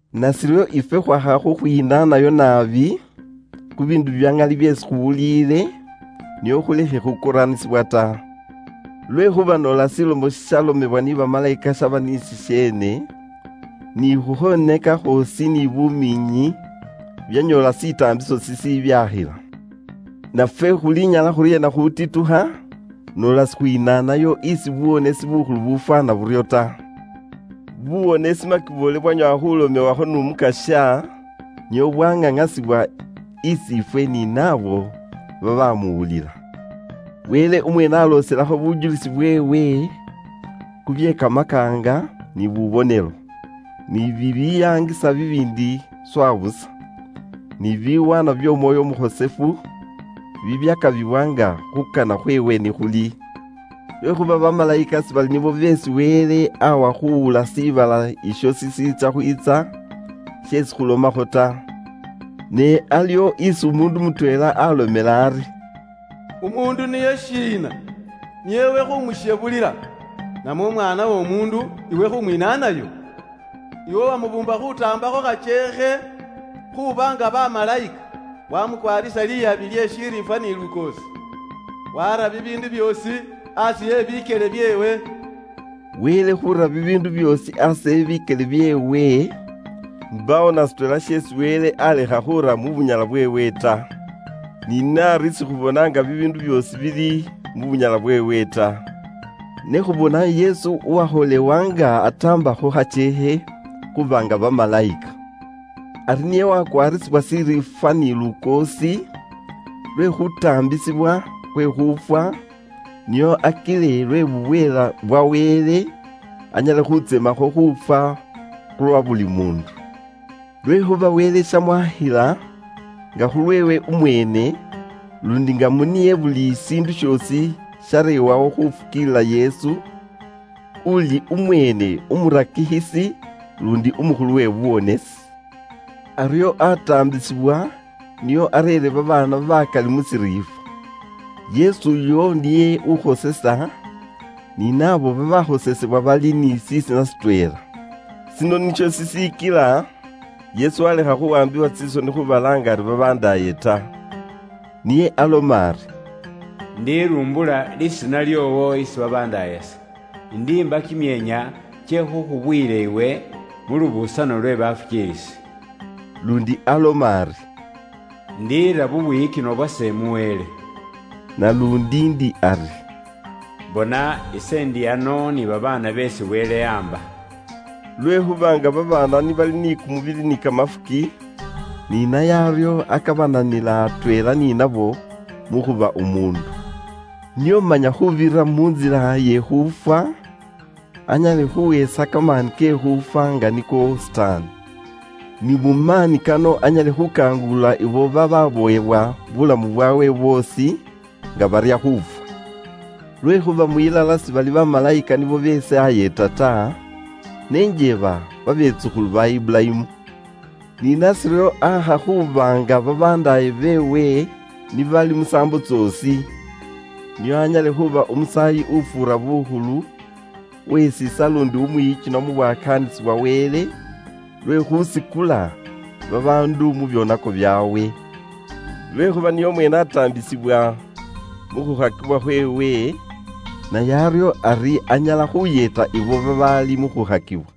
Nashiryo ifwe khwaakha khukhwinaanayo naabi khu biindu bya ŋali byeesi khuwuliile, nio khulekhe khukoraanisibwa ta. Lwekhuuba noola shilomo shishalomebwa ni bamalayika shaba ni shisheene, ni khukhwoneka khwoosi ni bumiinyi byanyoola shitaambiso shishibyakhila. Nafwe khulinyala khuryeena khutitukha, noola sikhwinaanayo isi buwonesi bukhulu bufwaana buryo ta? Buwonesi makiboole bwanyoowa khulomewakho n'Umukasya, nio bwaŋaŋasibwa is'ifwe ni naabo babamuwulila. Wele umweene aloselakho bujulisi bweewe khu bye kamakaanga, ni bubonelo, ni bibiyaangisa bibiindi swa busa, ni biwaanwa by'Omwoyo Umukhosefu bibyakabibwa nga khuukana khweewe ni khuli. Lwekhuuba bamalayika sibali nibo beesi Wele awa khuwula shiibala isho shiitsya khwiitsa, sheesi khulomakho ta. Ne aliwo isi umuundu mutweela alomela ari, “Umuundu niye shiina, nio iwe khumushebulila. Namwe Umwaana w'Omuundu iwe khumwinaanayo? Iwe wamubuumba khuutaambakho khakyeekhe khuuba nga bamalayika, wamukwaarisa liyabi lye shiriifwa ni lukoosi. Waara bibiindu byoosi aasi e bikyele byeewe.” Wele khuura bibiindu byoosi aasi e bikyele byeewe, mbaawo na shitweela sheesi Wele alekha khuura mu bunyala bweewe ta. Ni naari sikhubona nga bibiindu byoosi bili mu bunyala bweewe ta. Ne khubona Yesu uwakholewa nga ataambakho khakyeekhe khuuba nga bamalayika; ari niye wakwaarisibwa shiriifwa ni lukoosi, lwe khutaambisibwa khwe khuufwa, nio akile lwe bubweela bwa Wele, anyale khutsemakho khuufwa khulwa buli muundu. Lwekhuuba Wele shamwaakhila, nga khulweewe umweene, luundi nga mu niye buli shiindu shoosi shareewawo khufukiilila Yesu, uuli umweene umurakikhisi luundi umukhulu we buwonesi. Aryo aataambisibwa nio akile areere babaana bakali mu shiriifwa. Khulwekhuuba Yesu uyo ureera bukhosefu, ni naabo beesi areerera bukhosefu bali ni Wele nga Paapa waabwe. Shino nisho shishikila Yesu walekha khuwaambiwa tsisoni khubalaanga ari babandaaye ta. Niye aloma ari, “Indirumbula lisiina lyoowo isi babandaayase. Indiimba kimyeenya kye khukhubuyila iwe mu lubusano lwe bafukiilisi.” Luundi aloma ari, “Indiira bubwiyikinwa bwase mu Wele.” Naluundi ndi ari: “Bona ise ndi ano ni babaana beesi Wele aamba ise.” Lwekhuuba nga babaana ni bali ni kumubili ni kamafuki, ni naye aryo akabananila atweela ni nabo mu khuba umuundu, nio manya khuubirira mu ntsila ye khuufwa, anyale khuhesa kamaani ke khuufwa nga niko Sitaani. Ni mu maani kano anyale khukangulula ibo bababowebwa buulamu bwaabwe bwoosi nga barya khuufwa. Lwekhuuba mwilala sibali bamalayika nibo beesi ayeeta ta, ne njeeba babetsukhulu ba Iburayimu. Ni nashiryo aakha khuuba nga babandaaye beewe ni bali musaambo tsoosi, nio anyale khuuba Umusaayi ufuura bukhulu, uwe shiisa luundi umwiyikinwa mu bwakaanisi bwa Wele, lwe khuusikula babaandu mu byoonako byaabwe. Lwekhuuba niye umweene ataambisibwa mu khukhakibwa khweewe, naye aryo ari anyala khuyeeta ibo babaali mu khukhakibwa.